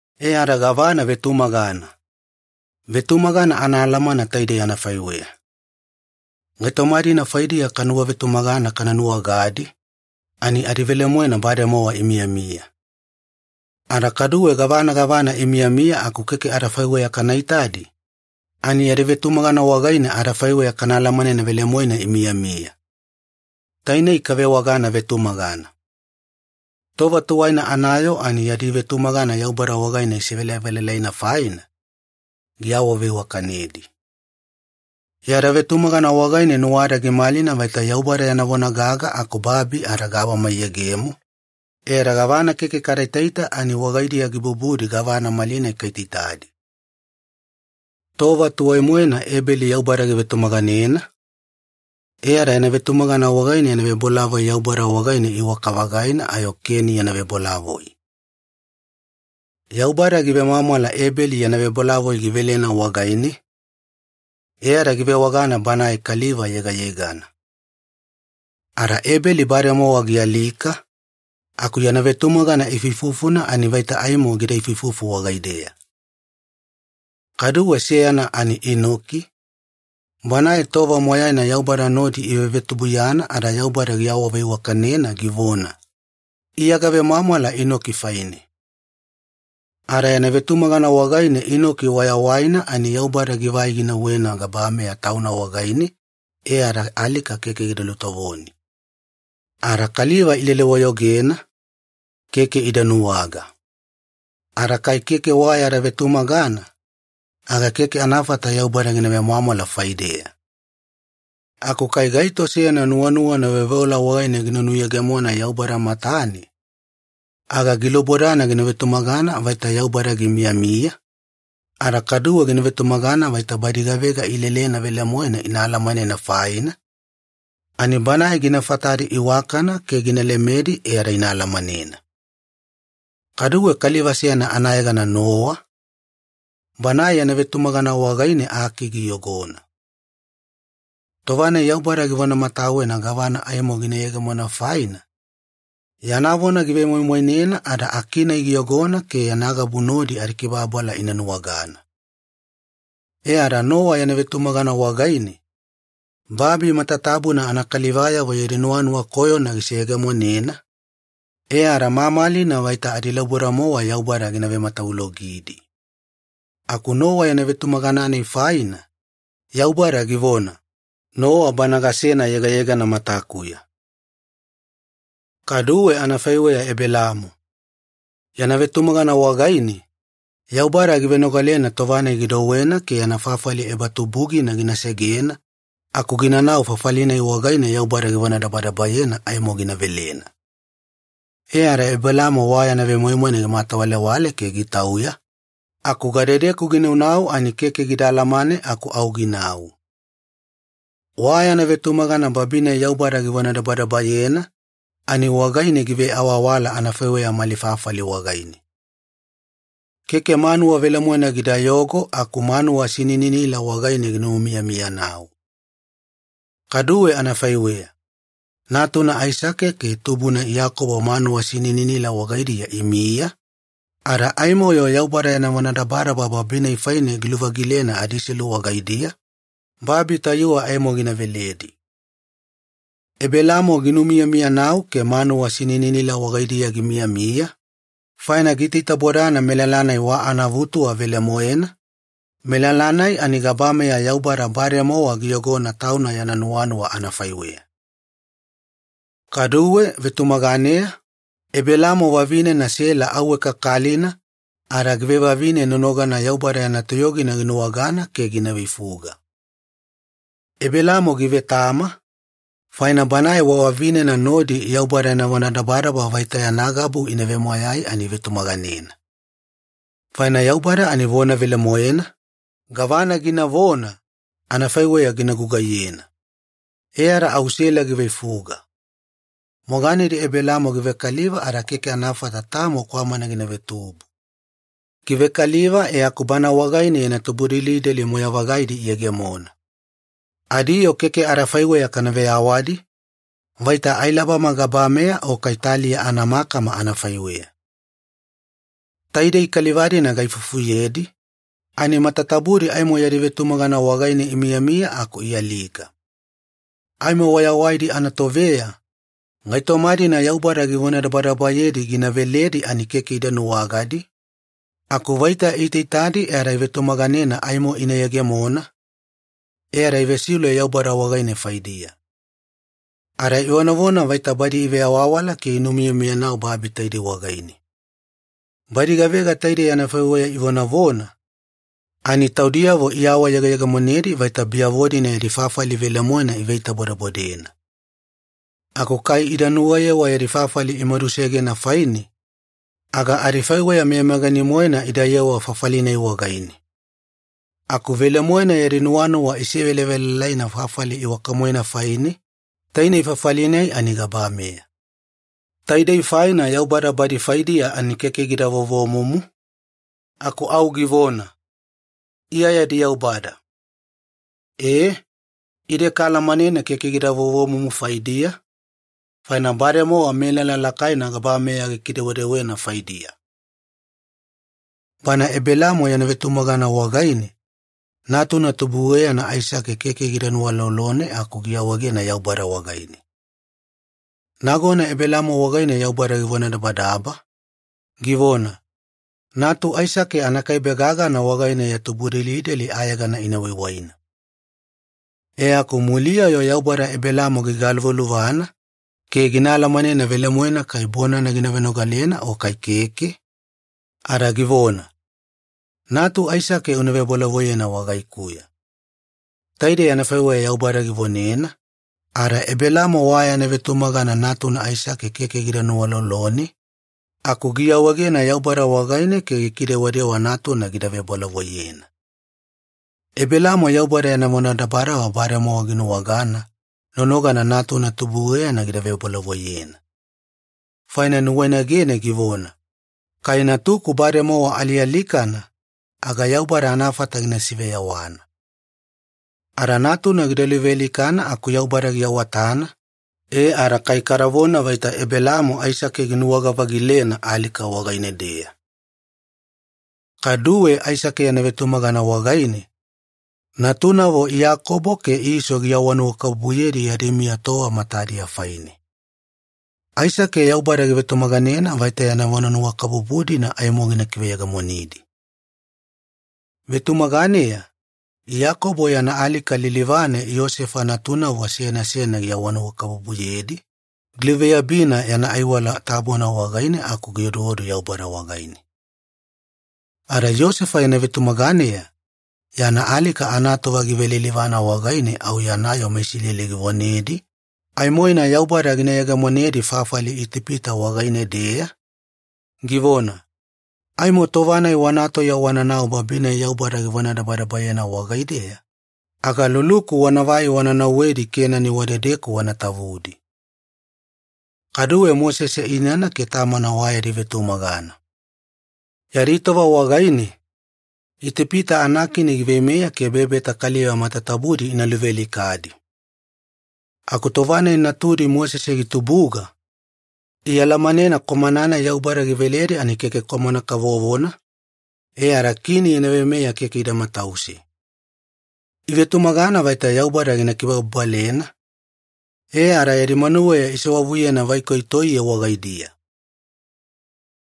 E ada gavana vetumagana? Vetumagana anaalamana taidei anafaiweya. Gaitoma-dina faidiya kanuwavetumagana kana nuwagadi, ani adivelemoena bademowa imiyamiya. Ada kaduwe gavana gavana imiyamiya aku keke adafaiweya kana itadi, ani yada vetumagana wagaine adafaiweya kana alamanena velemoena imiyamiya. Tainei kavewagana ‘vetumagana’. Tova tuwaina anayoo ani yadi vetumagana Yaubada wagaine isevelavelalaina faina, giawaveiwakanedi. Yada vetumagana wagaine nuwada gimalina vaita Yaubada yana vona gaga aku babi ada gabama iyegemo, e ada gavana keke kada itaita ani wagaidiya gibubudi gavana malinai kaitaitadi. Tova tuwai-moena Ebeli Yaubada givetumaganena, e ada yana vetumagana wagaine yana vebolavoi Yaubada wagaine iwaka-vagaina ayo Keni yana vebolavoi. Yaubada givemwamwala Ebeli yana vebolavoi givelena wagaine, e ada givewagana banae kaliva yegayegana. Ada Ebeli bademowa gialika, aku yana vetumagana ifuifufuna ani vaita aimo gida ifuifufu wagaideya. Kaduwe seyana ani Inoki, banae tova moyaina Yaubada nodi ivevetubuiyana ada Yaubada giawaveiwakanena givona, “Iya gavemwamwala Inoki faine.” Ada yana vetumagana wagaine Inoki wayawaina ani Yaubada givai ginauwena gabameya Tauna wagaine, e ada alika keke gida lutovoni. Ada kaliva ilele-wayogena, keke ida nuwaga. Ada kai keke wa yada vetumagana, aga keke anafata Yaubada gina vemwamwala faideya. Aku kai gaito seyana nuwanuwana veoveola wagaine gina nuyegemona Yaubada matane, aga gilubodana gina vetumagana vaita Yaubada gimiyamiya, ada kaduwe gina vetumagana vaita badi gavega ilelelena velemoena ina alamanena faina, ani Banae gina fatadi iwakana ke gina lemedi e ada ina alamanena. Kaduwe kaliva seyana anayegana Nowa, banae yana vetumagana wagaine aki giyogona. Tova-nai Yaubada givonamatawena gavana aimo gina yegemona faina, yana vona givemoimoinena ada aki-nai giyogona ke yana gabu nodi adikibababala ina nuwagana. E ada Nowa yana vetumagana wagaine, babi matatabuna anakalivayavo yadi nuwanuwa koyona giseyegemonena, e ada mamalina vaita adilauboda-mowa Yaubada gina vematavulogidi. Aku Nowa yana vetumagana-nai faina, Yaubada givona, “Nowa bana gasena yegayegana matakuya.” Kaduwe anafaiweya Ebelaamo. Yana vetumagana wagaine, Yaubada givenogalena tova-nai gidouwena ke yana fafali ebatubugina gina segena aku ginanau fafali-nai wagaine Yaubada givonadabadabayena aimo gina velena. E ada Ebelaamo wa yana vemoimoina gimatawalewale ke gitauya, aku gadedeku ginaunau ani keke gida alamane aku au ginau. Wa yana vetumagana babi-nai Yaubada givonadabadabayena, ani wagaine giveawawala anafaiweya malifafali wagaine. Keke manuwa velemoena gidayogo aku manuwa sinininila wagaine ginumiyamiyanau. Kaduwe anafaiweya, natuna Aisake ke tubuna Iyakobo manuwa sinininila wagaidiya imiya, ada aimo-yo Yaubada yana vonadabadaba babi-nai faine giluvagilena adiselu wagaidiya, babi tayuwe aimo gina veledi. Ebelaamo ginumiyamiyanau ke manuwa sinininila wagaidiya gimiyamiya, faina giitaitabodana melala-nai wa anaavutuwa velemoena, melala-nai ani gabameya Yaubada bademowa giyogona Tauna yana nuwanuwa anafaiweya. Kaduwe vetumaganeya, Ebelaamo vavinena Sela auwe kakalina ada givevavine nonogana Yaubada yana toyogina ginuwagana ke gina veifuga. Ebelaamo givetama, faina banae wa vavinena nodi Yaubada yana vonadabadaba vaita yana gabu ina vemoyai ani ivetumaganena. Faina Yaubada ani vona velemoena, gavana ginavona, anafaiweya gina gugaiyena. E ada au Sela giveifuga. Moganedi Ebelaamo givekaliva ada keke anafata tamo kwamana gina vetubu. Givekaliva e aku bana wagaine yana tubudelideli moyai-vagaidi iyegemona. Adiyoo keke adafaiweya kana veyawadi, vaita ailabama gabameya o kai taliya anamakama anafaiweya. Taidei kaliva-dina gaifufuyedi, ani matatabudi aimo yadi vetumagana wagaine imiyamiya aku ialika. Aimo wayawaidi anatoveya, gaitoma-dina Yaubada givonadabadabayedi gina veledi ani keke ida nuwagadi, aku vaita iitaitaidi e ada ivetumagananena aimo ina yegemona, e ada ivesiule Yaubada wagaine faidiya. Ada ivonavona vaita badi iveawawala ke inumiyamiyanau babi taidei wagaine. Badi gavega taidei anafaiweya ivonavona, ani taudiyavo iawayegeyegemonedi vaita biyavo-dina yadi fafali velemoena iveitabodebodena. Aku kai ida nuwayewa yadi fafali imadusegena faine, aga adifaiweya meyameyagani-moena idayewa fafali-nai wagaine. Aku velemoena yadi nuwanuwa isevelavelalaina fafali iwaka-moena faine, tainei fafali-nai ani gabameya. Taidei faina Yaubada badi faidiya ani keke gida vovomumu, aku au givona, “Iya yadi Yaubada.” Ee, ide kaalamanena keke gida vovomumu faidiya, faina bademowa melala lakaina gabameya gikidewedewena faidiya. Bana Ebelaamo yana vetumagana wagaine, natuna tubueyana Aisake keke gida nuwalolone aku giawaegena Yaubada wagaine. Nagona Ebelaamo wagaine Yaubada givonadabadaba, givona, “Natu Aisake anakaibe gagana wagaine ya tubudelideli ayegana ina waiwaina.” E aku muliya-yo Yaubada Ebelaamo gigaluvaluvana ke gina alamanena velemoena kai bonana gina venogalena o kai keke, ada givona, “Natu Aisake una vebolavoiyena wagaikuya.” Taidei anafaiweya Yaubada givonena, ada Ebelaamo wa yana vetumagana natuna Aisake keke gida nuwalolone, aku giawaegena Yaubada wagaine ke gikidewadewa natuna gida vebolavoiyena. Ebelaamo Yaubada yana vonadabadaba bademowa ginuwagana nonogana natuna tubueyana gida vebolavoiyena. Faina nuwainagene givona, “Kai natuku bademowa alialikana, aga Yaubada anafata gina siveyawana.” Ada natuna gida luvealikana aku Yaubada giawatana, e ada kai kadavona vaita Ebelaamo Aisake ginuwaga-vagilena alika wagaine-deya. Kaduwe Aisake yana vetumagana wagaine, natunavo Iyakobo ke Iso giawanuwakabubuyedi yadi miya tova matadiya faine. Aisake Yaubada givetumaganena vaita yana awanuwakabubu-dina aimo gina kiveyegemonidi. Vetumaganeya, Iyakobo yana alika lilivane Iyosefa natunavo seyana seyana giawanuwakabubuyedi, giluveyabina yana aiwala tabona wagaine aku gioduodu Yaubada wagaine. Ada Iyosefa yana vetumaganeya, yana alika anatova givelilivana wagaine au yana yoo meIsileli givonedi aimoina Yaubada gina yegemonedi fafali Itipita wagaine-deya, givona, “Aimo tova-nai wana tauya wananau babi-nai Yaubada givonadabadabayena wagaideya, aga luluku wanavai wana nauwedi Kenani wadedeku wana tavudi.” Kaduwe Mosese inana ke tamana wa yadi vetumagana. Yadi tova wagaine, Itipita anakini giveimeya ke bebeta kaliva matatabudi ina luvealikadi. Aku tova-nai natudi Mosese gitubuga, ialamanena kwamana-nai Yaubada giveledi ani keke kwamana kavovona, e ada kini yana veimeya keke ida matause. Ivetumagana vaita Yaubada gina kibababalena, e ada yadi manuweya isewavuyena vaikoi toiye wagaidiya.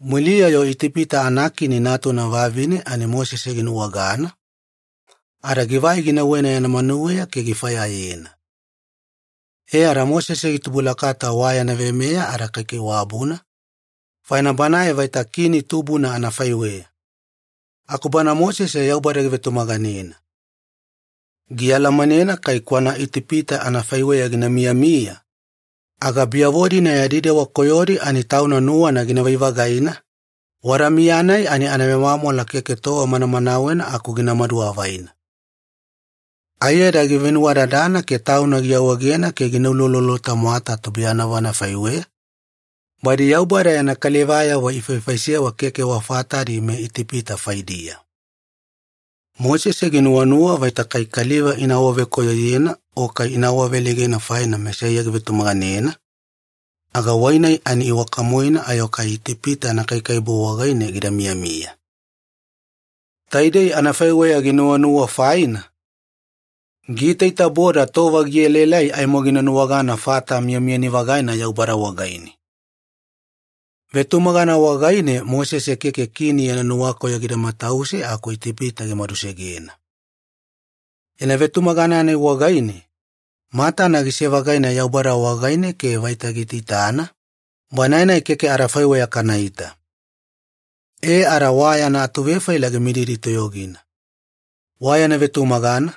Muliya-yo Itipita anakini natuna vavine ani Mosese ginuwagana, ada givai ginauwena yana manuweya ke gifayayena. E ada Mosese gitubulakata wa yana veimeya ada kaikaiwabuna, faina banae vaita kini tubuna anafaiweya. Aku bana Mosese Yaubada givetumaganena. Gialamanena kai tauna kwana Itipita anafaiweya gina miyamiya, aga biyavo-dina yadi dewa koyodi ani tauna nuwana ginavai-vagaina, wada miya-nai ani anavemwamwala keke tova manamanawena aku ginamadu avaina. Aiyada givenuwadadana ke tauna giawaegena ke gina uloulolo-tamwata tubuiyanavo anafaiweya, badi Yaubada yana kalivayavo ifaifaisewa keke wa fatadi meItipita faidiya. Mosese ginuwanuwa vaita kai kaliva ina awavekoyoyena o kai ina awaveleigena faina Mesaiya givetumaganena, aga wai-nai ani iwaka-moena ayo kai Itipita anakaikaiwabu wagaine gida miyamiya. Taidei anafaiweya ginuwanuwa faina, giitaitaboda tova gielaelai aimo gina nuwagana fata miyamiyani-vagaina Yaubada wagaine. Vetumagana wagaine Mosese keke kini yana nuwakoyo gida matause aku Itipita gimadusegena. Yana vetumagana-nai wagaine, matana gise-vagaina Yaubada wagaine ke vaita giitaitana, Banae-nai keke adafaiweya kanaita. E ada wa yana atuvefaila gimididi toyogina. Wa yana vetumagana,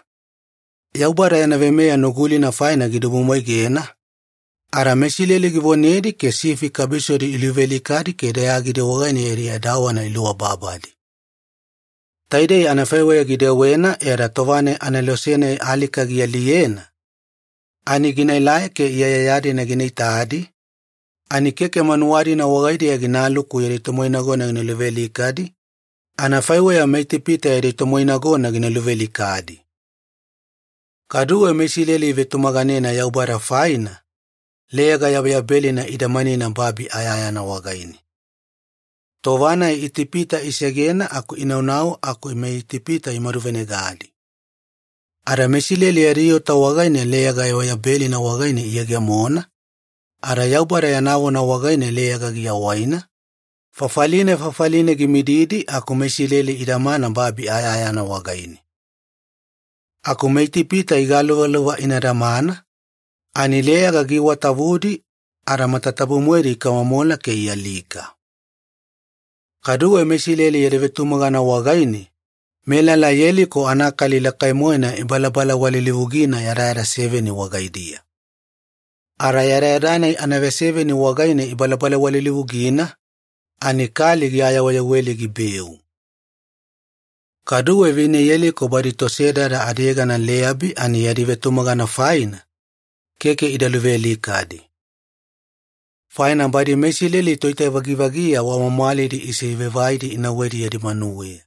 Yaubada yana veimeya Nugulina faina gidibumwaigena, ada meIsileli givonedi ke sifi kabisodi iluvealikadi ke dayagidi wagaine yadi edawana iluababadi. Taidei anafaiweya gidewena e ada tova-nai anelose-nai alika gialiyena, ani ginaelai ke iyaiyaya-dina gina itadi, ani keke manuwa-dina wagaidiya ginaluku yadi tomoinagona gina luvealikadi anafaiweya meItipita yadi tomoinagona gina luvealikadi. Kaduwe meIsileli ivetumaganena Yaubada faina, Leyaga Yabeyabelina idamanina babi ayayana wagaine. Tova-nai Itipita isegena aku inaunau aku meItipita imaduvenegadi. Ada meIsileli yadi ota wagaine Leyaga Yabeyabelina wagaine iyegemona, ada Yaubada yana vona wagaine leyaga giawaina, fafaline fafaline gimididi aku meIsileli idamana babi ayayana wagaine. Aku meItipita igaluvaluva ina damana, ani leyaga giiwatavudi, ada matatabu-moedi ikamomola ke ialika. Kaduwe meIsileli yadi vetumagana wagaine, melala Yeliko anakali lakai-moena ibalabalawalilivugina yadayada seveni wagaidiya. Ada yadayada-nai anaveseveni wagaine ibalabalawalilivugina, ani kali giayaweyaweli gibeu. Kaduwe vine Yeliko badi tosedada adiyegana Leyabi ani yadi vetumagana faina, keke ida luvealikadi. Faina badi meIsileli toitavagivagiya wa mwamwalidi isivaivaidi inauwedi yadi manuweya.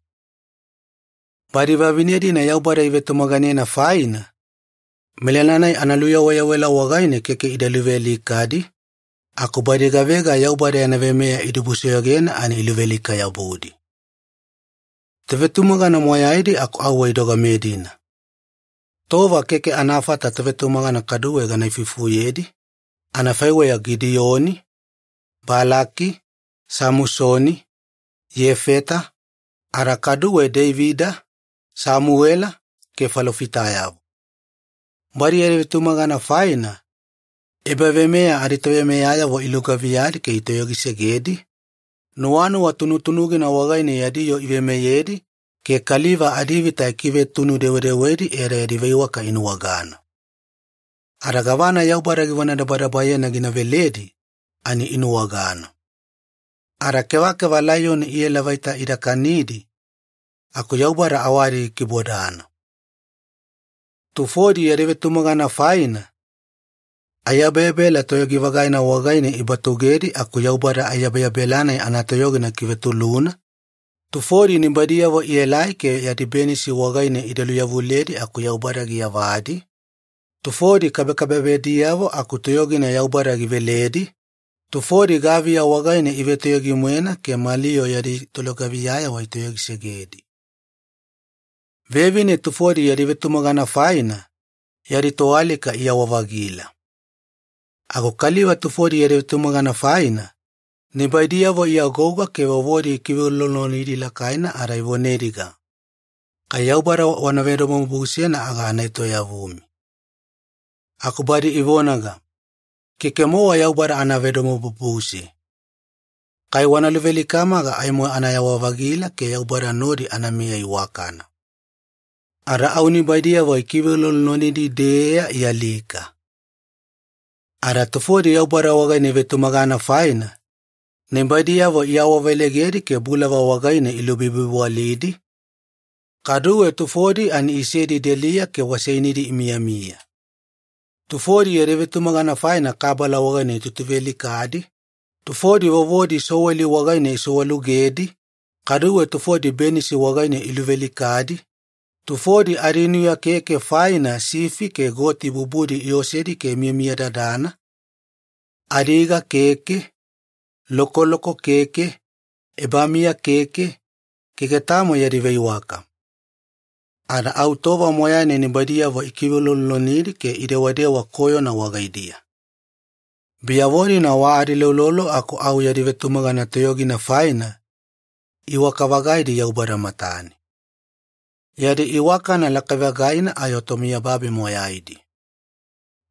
Badi vavine-dina Yaubada ivetumaganena faina, melala-nai analuyaweyawela wagaine keke ida luvealikadi, aku badi gavega Yaubada yana veimeya idibusoyogena ani iluvealika-yabudi. Tovetumagana moyaidi aku auwe idogame-dina. Tova keke anafata tovetumagana kaduwe gana ifuifufuyedi, anafaiweya Gidiyoni, Balaki, Samusoni, Iyefeta, ada kaduwe Deivida, Samuwela, ke falofitayavo. Badi yadi vetumagana faina, ebaveimeya aditoveimeyayavo ilugaviyadi ke itoyogisegedi, nuwanuwa tunutunugina wagaine yadi yoo iveimeyedi, ke kaliva adivita ikivetunu-dewedewedi e ada yadi veiwaka inuwagana. Ada gavana Yaubada givonadabadabayena gina veledi ani inuwagana. Ada kevakeva laiyoni iela vaita ida kanidi, aku Yaubada awadi gikibodana. Tufodi yadi vetumagana faina, aiyabeyabela toyogi-vagaina wagaine ibatugedi aku Yaubada aiyabeyabela-nai anatoyogina gikivetuluna, tufodi nibaidiyavo ielai ke yadi benisi wagaine ida luyavuledi aku Yaubada giyavadi, tufodi kabekabebediyavo aku toyogina Yaubada giveledi, tufodi gaviya wagaine ivetoyogi-moena ke mali yoo yadi tolugaviyayavo itoyogisegedi. Vevine tufodi yadi vetumagana faina, yadi toalika iyawa-vagila. Aku kaliva tufodi yadi vetumagana faina, nibaidiyavo iagouga ke vovodi ikiveuloulolonidi lakaina ada ivonediga, “Kai Yaubada wana vedomobubusena aga ana etoyavumi.” Aku badi ivonaga, “Keke-mowa Yaubada ana vedomobubuse. Kai wana luvealikama aga aimo anayawa-vagila ke Yaubada nodi anamiya iwakana.” Ada au nibaidiyavo ikiveuloulolonidi-deeya, ialika. Ada tufodi Yaubada wagaine ivetumagana faina, nibaidiyavo iawaveleigedi ke bulava wagaine ilubibiwalidi, kaduwe tufodi ani isedi deliya ke waseinidi imiyamiya. Tufodi yadi vetumagana faina kabala wagaine itutuvealikadi, tufodi vovodi soweli wagaine isowalugedi, kaduwe tufodi benisi wagaine iluvealikadi, tufodi adinuya keke faina sifi ke goti bubudi iosedi ke imiyamiyadadana, adiga keke, lokoloko keke, ebamiya keke, keke tamo yadi veiwaka. Ada au tova moyaina nibaidiyavo ikiveuloulolonidi ke idewadewa koyona wagaidiya. Biyavo-dina wa adiuloulolo aku au yadi vetumagana toyogina faina, iwaka-vagaidi Yaubada matane. Yadi iwakana lakai-vagaina ayo tomiyababi moyaidi.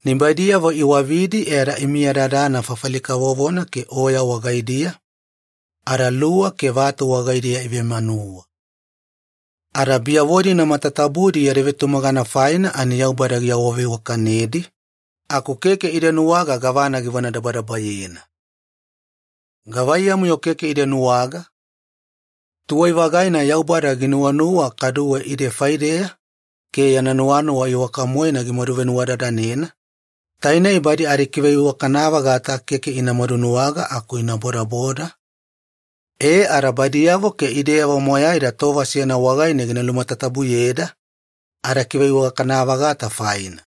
Nibaidiyavo iwavidi e ada imiyadadana fafali kavovona ke oya wagaidiya, ada luwa ke vatu wagaidiya ivemanuwa. Ada biyavo-dina matatabudi yadi vetumagana faina ani Yaubada giawaveiwakanedi, aku keke ida nuwaga gavana givonadabadabayena. Gavaiyamu-yo keke ida nuwaga? Tuwai-vagaina Yaubada ginuwanuwa kaduwe ide faideya ke yana nuwanuwa iwaka-moena gimadu venuwadadanena, tainei badi adikiveiwakana-vagata keke ina madunuwaga aku ina bodaboda, e ada badiyavo ke ideyavo moyaida tova seyana wagaine gina lumatatabuyeda adakiveiwakana-vagata faina.